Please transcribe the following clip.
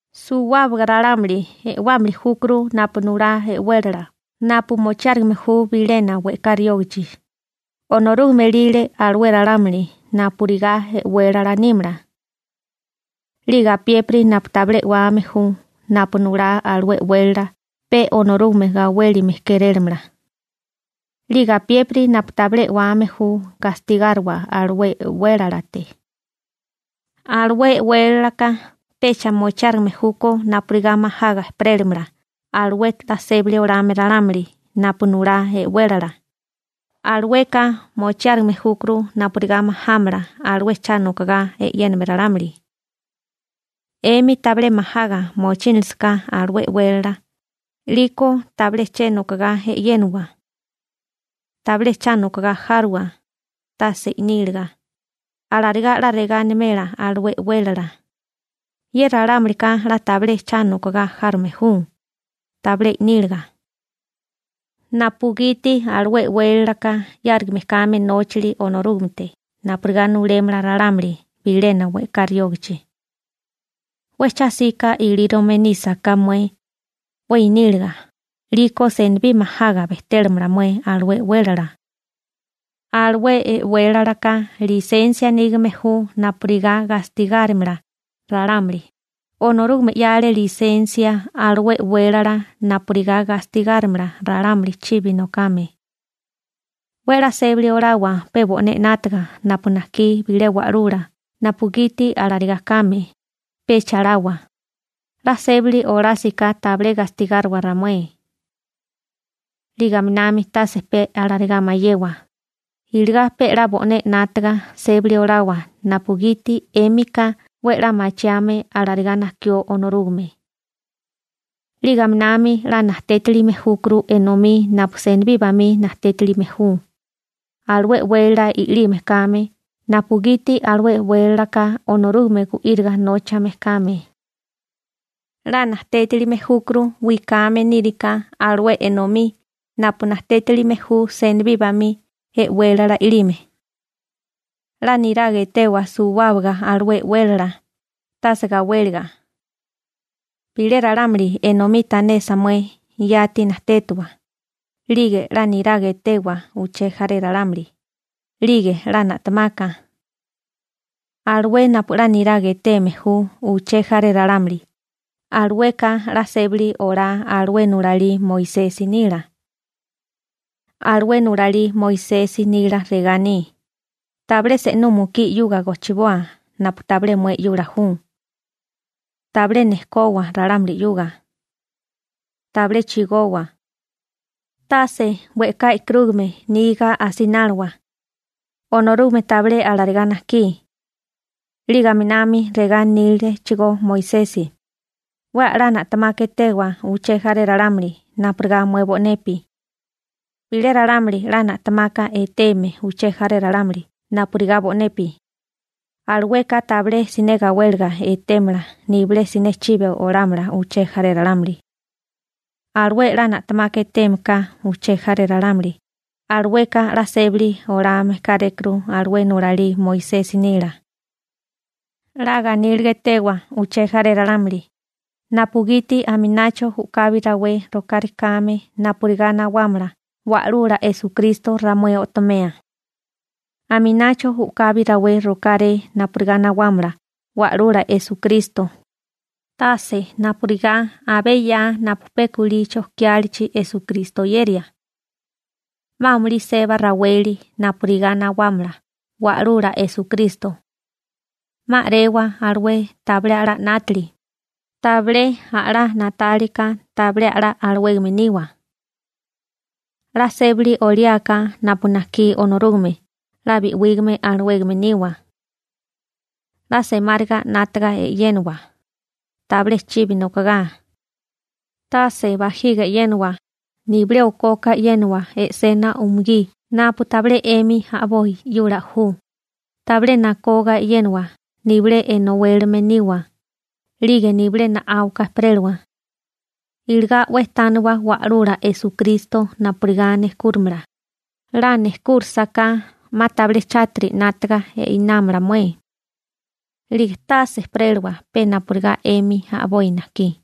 Suwábaga ralámuli e'wámili júkuru napu nulá e'wélala napu mochiárigime ju bilena we'ká riógachi, Onorúgame elile alué ralámuli napurigá e'wélala nímala. 'Lige apiépiri napu tabilé e'wame ju napu nulá alué e'wélala pe Onorúgame gawélime kérélamala. 'Lige apiépiri napu tabilé e'wame ju gastigáriwa alué e'wélalate. Alué e'wélalaka pecha mochiárigime júkó napurigá majaga ejperélimala alué 'la sébali olame ralámuli napu nulá e'wélala, alueka mochiárigime júkuru napurigá majámala alué cha nokogá e'yéname ralámuli. 'Emi tabilé majaga mochínilisaká alué e'wélala, 'liko tabilé che nokogá e'yéniwa. Tabilé cha nokogá járowa, tase i'níliga, alarigá 'la regá animela alué e'wélala: «Ye ralámulika 'la tabilé cha nokogá járome ju, tabilé i'níliga», napugiti alué e'wélalaka 'yárigame kame nóchali Onorúgamete napurigá nulémala ralámuli bilena we'ká riógachi. 'We cha 'sika ilírome nísaká mué, 'we iníliga, 'liko senibí majaga bejtélamala mué alué e'wélala. Alué e'wélalaka lisensia nígame ju napurigá gastigárimala ralámuli, Onorúgame 'yale lisensia alué e'wélala napurigá gastigárimala ralámuli chibi nokame. 'We 'la sébali olawa pe bo'né 'nátaga napu najkí bilé wa'lula napugiti alarigá kame, pecha lawa: «'La sébali olásiká tabilé gastigáriwa ramué.» 'Lige aminami tase pe alarigá mayewa, iligá pe 'la bo'né 'nátaga sébali olawa napugiti 'émika 'we 'la machiame alarigá najkió Onorúgame. 'Lige aminami 'la najtétilime júkuru enomí napu senibí bamí najtétilime ju (impuesto), alué e'wélala i'lime kame napugiti alué e'wélalaka Onorúgame gu'íriga nóchame kame. 'La najtétilime júkuru wikame níriká alué enomí napu najtétilime ju senibí bamí e'wélala i'lime. 'La niraga etewa suwábaga alué e'wélala, tase gawéliga. Bilé ralámuli enomí tanesa mué, yati najtétawa, 'lige 'la niraga etewa uché jaré ralámuli, 'lige 'la na'temaka. Alué napu 'la niraga eteme ju uché jaré ralámuli, alueka 'la sébali olá alué nulalí Moisesi nila. Alué nulalí Moisesi nila regá aní: «Tabilé se'nú mukí 'yuga gojchiboa napu tabilé mué 'yula ju. Tabilé nejkowa ralámuli 'yuga. Tabilé chigowa. Tase we'ká e'karúgame niga asináliwa. Onorúgame tabilé alarigá najkí.» 'Lige aminami regá anílechigó Moisesi: «'We a'lá na'temaka etewa uché jaré ralámuli napurigá mué bo'nepi.» Bilé ralámuli 'la na'temaka eteme uché jaré ralámuli napurigá bo'nepi, alueka tabilé siné gawéliga etémala nibilé siné chibi olámala uché jaré ralámuli. Alué 'la na'temaka eteme ka uché jaré ralámuli, alueka 'la sébali olame kárékuru alué nulalí Moisesi nila. 'La ganíliga etewa uché jaré ralámuli, napugiti aminacho u'kabi rawé rokárekáme napurigá nawámala Wa'lula Esukristo ramué o'tomea. Aminacho u'kabi rawé rokáré napurigá nawámala Wa'lula Esukristo, tase napurigá abé 'ya napu pe kulí chojkiálichi Esukristo oyeria. 'Ma amulí seba raweli napurigá nawámala Wa'lula Esukristo. 'Ma a'rewa alué tabilé a'lá 'nátili, tabilé a'lá na'tálika tabilé a'lá alawégame niwa. 'La sébali oliáká napu najkí Onorúgame 'la bi'wígame alawégame niwa. 'La semáriga 'nátaga e'yénawa, tabilé chibi nokogá, tase bajiga e'yénawa, nibilé okoka e'yénawa e'sena umugí napu tabilé 'emi a'boi 'yula ju, tabilé nakoga e'yénawa, nibilé enowélame niwa, 'lige nibilé na'áuka ejperélawa. Iligá 'we tániwa Wa'lula Esukristo napurigá nejkúrimala, 'la nejkúrisaká 'ma tabilé chátiri 'nátaga einámala mué. 'Lige tase ejperélawa pe napurigá 'emi a'boi najkí.